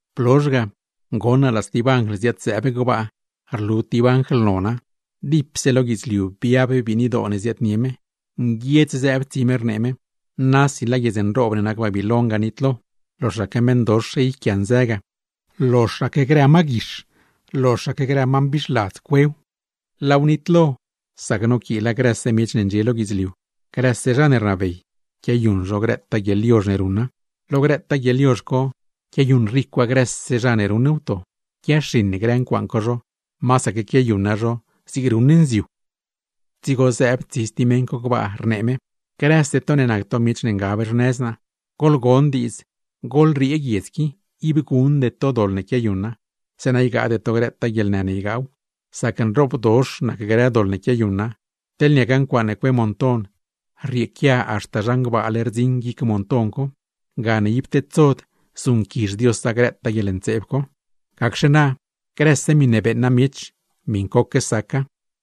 Blozh ga, goṉ naa laa stib anjl ziad-zëëb gbaa, rlu tib anjl nona, dipse lo guidzliu biab biinidoo ne ziaadnie me, nguiedz zëëb tsi me rnee me: ―¡Nasi laa guiedz nroob ne nac Babiloin ga nitlo! ¡Loxaque meṉdox yquianzë ga, loxaque grë ma guix, loxaque grë ma mbixladz cuew! Laaw nitlo, sac noquiila grëse miech ne ndxie lo guidzliu, grëse zha ne rnabey, quiayuṉ zho grëtaa guieḻyozh ne ruṉa. Lo grëtaa guieḻyozh co quiayuṉ ricwa grëse zha ne ruṉ wto; quiaxiṉ grë ncuaaṉ co zho, masaque quiayuṉa zho zig ruṉ nziu. Dzigo zëëb stib tsi meṉ co gbaa, rnee me: ―¡Grëse to ne nac to miech ne ngab xnëz naa, goḻgon diidz, goḻriee guiedz qui! Ib guṉde to doḻ ne quiayuṉa; zeeṉa ygaade to grëtaa guieḻnë ne ygaaw, sac nroobdox nac grë doḻ ne quiayuṉa, teḻne niaca ncuaaṉe cue monton, rrieequia haxta gbaale rdziṉ guic monton co; gane ib tedsod zuṉquizh Diosa grëtaa guieḻntseeb co. ’Gacxe na grëse miṉe beeṉa miech, miṉcoque saca.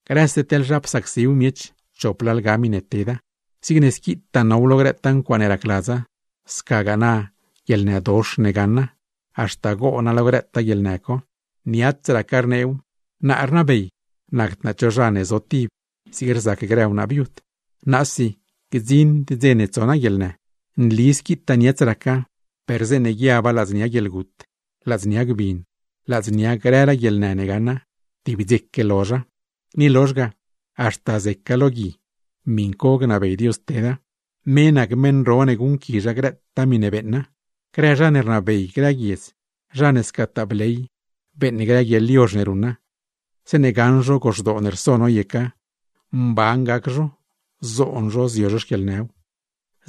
Grëse teḻ zha psacsiw miech, chop lalga miṉe teda. Zigne squitaa now lo grëtaa ncuaaṉe racladza; scagaa na guieḻnëdox ne gaṉa, haxta goona lo grëtaa guieḻnë co. Niats raca rneew: “Naa rnabey. Nacd naa cho zha ne zotib, zig rzac grë wnaa viud; naasi gdziṉd dze ne tso naa guieḻnë.” ’Nli squitaa niats raca, per zeeṉe guiaba ladznia guieḻgut, ladznia gbin, ladznia grëraa guieḻnë ne gaṉa, tib dzeque lozha. Ni lozh ga, haxta zeca lo gui; miṉ co gnabey Dios teda. ¡Me nac meṉ ro ne guṉquizha grëtaa miṉe beeṉa! Grë zha ne rnabey grë guiedz, zha ne scataa bley beeṉ grë guieḻyozh ne ruṉa; zeeṉe gaṉ zho goxdoo ne rso noyeca, mban gac zho, zoon zho zio zho xquieḻnëw.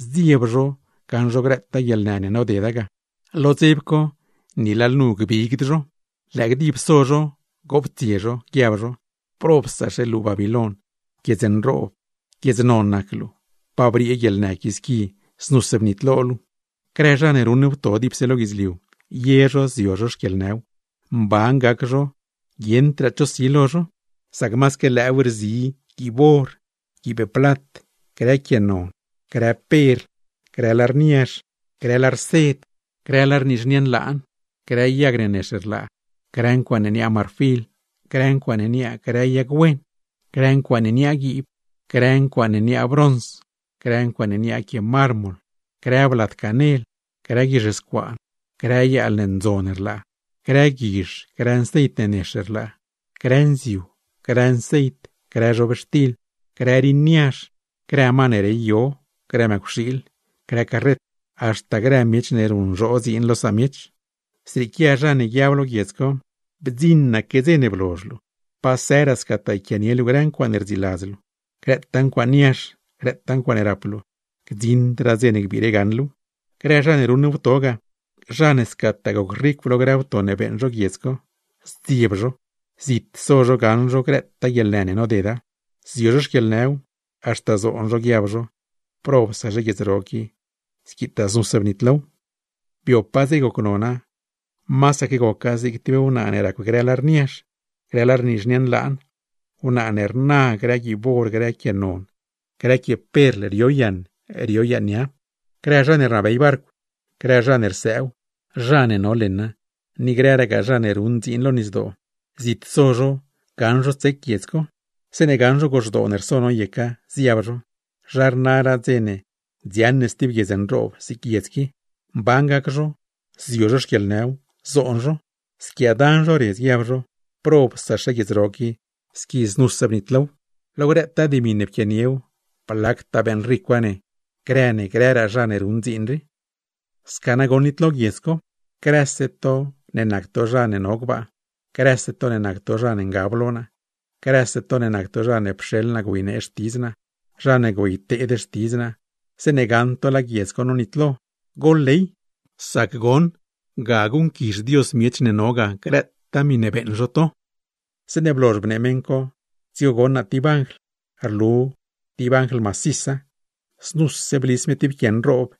Zdzieb zho gaṉ zho grëtaa guieḻnë ne nodeda ga, lo dzeb co, ni lalnu gbigd zho. Lëë gdib so zho goptsie zho, guiab zho: “¡Probsaxe luu Babiloin, guiedz nroob, guiedz non nac luu! ¡Pa briee guieḻnë qui squi znuse nitlo luu!” ’Grë zha ne ruṉ wto dipse lo guidzliu, ye zho zio zho xquieḻnëw, mban gac zho guieṉdraa cho si lo zho. Sac masaque lëëw rzi: guiib or, guiib plat, grë quie non, grë perl, grë lar niazh, grë lar sed, grë lar nizhnie nlaan, grë yag ne nex rlaa, grë ncuaaṉe niaa marfil, grë ncuaaṉe niaa grë yag wen, grë ncuaaṉe niaa guiib, grë ncuaaṉe niaa brons, grë ncuaaṉe niaa quie mármol, grë blad canel, grë guizh scuaan, grë yaal ne ndzon rlaa, grë guizh, grë nceit ne nex rlaa, grë nziu, grë nceit, grë zhobxtil, grë rin niazh, grë ma ne rey yo, grë mëcwxiil, grë carret, haxta grë miech ne ruṉzhoo dziin lo samiech. ’Zrieequia zha ne guiab lo guiedz co: “¡Bdziṉaque dze ne blozh luu, pa sëraa scataa yquianie luu grë ncuaaṉe rdziladz luu! ¡Grëtaa ncuaaṉ niazh, grëtaa ncuaaṉe rap luu, gdziṉdraa dze ne gbiire gaṉ luuw!” ’Grë zha ne ruṉ wto ga, zha ne scataa gocricw lo grë wto ne beeṉ zho guiedz co, zdzieb zho, zit so zho gaṉ zho grëtaa guieḻnë ne nodeda. Zio zho xquieḻnëw, haxta zoon zho guiab zho: “¡Probsaxe guiedz ro qui, squi znuse bnitlow! Biopaa dze gocnona, masaque goca zig tib wnaa ne racw grë lar niazh, grë lar nizhnie nlaan; wnaa ne rna grë guiib or, grë quie non, grë quie perl, rio yaṉ, rio yaṉ nia.” ’Grë zha ne rnabey barcw, grë zha ne rsëëw, zha ne no leṉa, ni grëragaa zha ne ruṉ dziin lo nisdoo, zit so zho gaṉ zho tsec guiedz co; zeeṉe gaṉ zho goxdoo ne rso noyeca, ziab zho: “¿Zha rnaraa dze ne dziaṉ ne stib guiedz nroob zig guiedz qui?” Mban gac zho, zio zho xquieḻnëw, zoon zho, squiaadan zho redz, guiab zho: “¡Probsaxe guiedz ro qui squi znuse bnitlow! Lo grëtaa dimi ne pquianiew, blactaa beeṉricwa ne grë ne grëraa zha ne ruṉ dziin rii.” ’Sca nagoṉ nitlo guiedz co. Grëse to ne nac to zha ne no gbaa, grëse to ne nac to zha ne ngab lo naa, grëse to ne nac to zha ne pxeḻ naa güeynee xtidz naa, zha ne güeyteed xtidz naa, zeeṉe gaṉ to laa guiedz co nonitlo, goḻley, sac goṉ ga guṉquizh Dios miech ne no ga grëtaa miṉe beeṉ zho to. Zeeṉe blozh bnee meṉ co, dzigo goṉ naa tib anjl, rlu tib anjl macisa, znuse blis me tib quie nroob,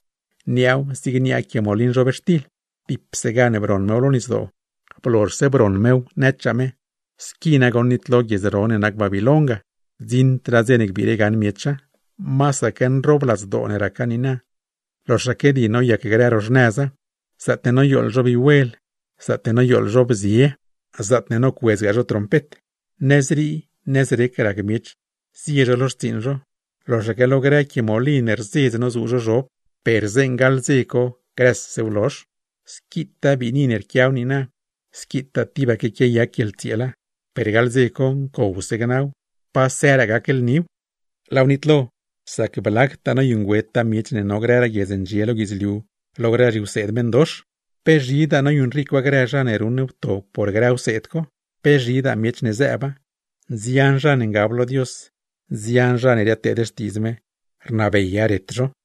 niaaw zig niaa quie molin zhobxtil dipse gan broṉ mew lo nisdoo; blozhse broṉ mew, nëchaa me: ―Squi nagoṉ nitlo guiedz ro ne nac Babiloin ga, gdziṉdraa dze ne gbiire gaṉ miecha. Masaque nroobladzdoo ne raca niina, loxaque di noyac grë ro xnëza, zaatne noyooḻ zho vihuel, zaatne noyooḻ zho bzie, zaatne nocuedzgaa zho trompet, nëzrii nëzrec rac miech zie zho lo xtsiiṉ zho, loxaque lo grë quie molin rzedz nozuu zho zhob; per gaḻ dze co grësew lozh. Squitaa biini ne rquiaw niina, squitaa tibaque quiayac guieḻtsieela, per gaḻ dze co ncowse gnaw, pa sëraa gac lniw. Laaw nitlo, sac blactaa noyuṉgüeta miech ne no grëraa guiedz ne ndxie lo guidzliu lo grë zhiwseed meṉdox; pe zhidaa noyuṉricwa grë zha ne ruṉ wto por grë wseed co; pe zhidaa miech zëëba. Nzian zha ne ngab lo Dios, nzian zha ne riadteed xtiidz me, rnabeya ret zho.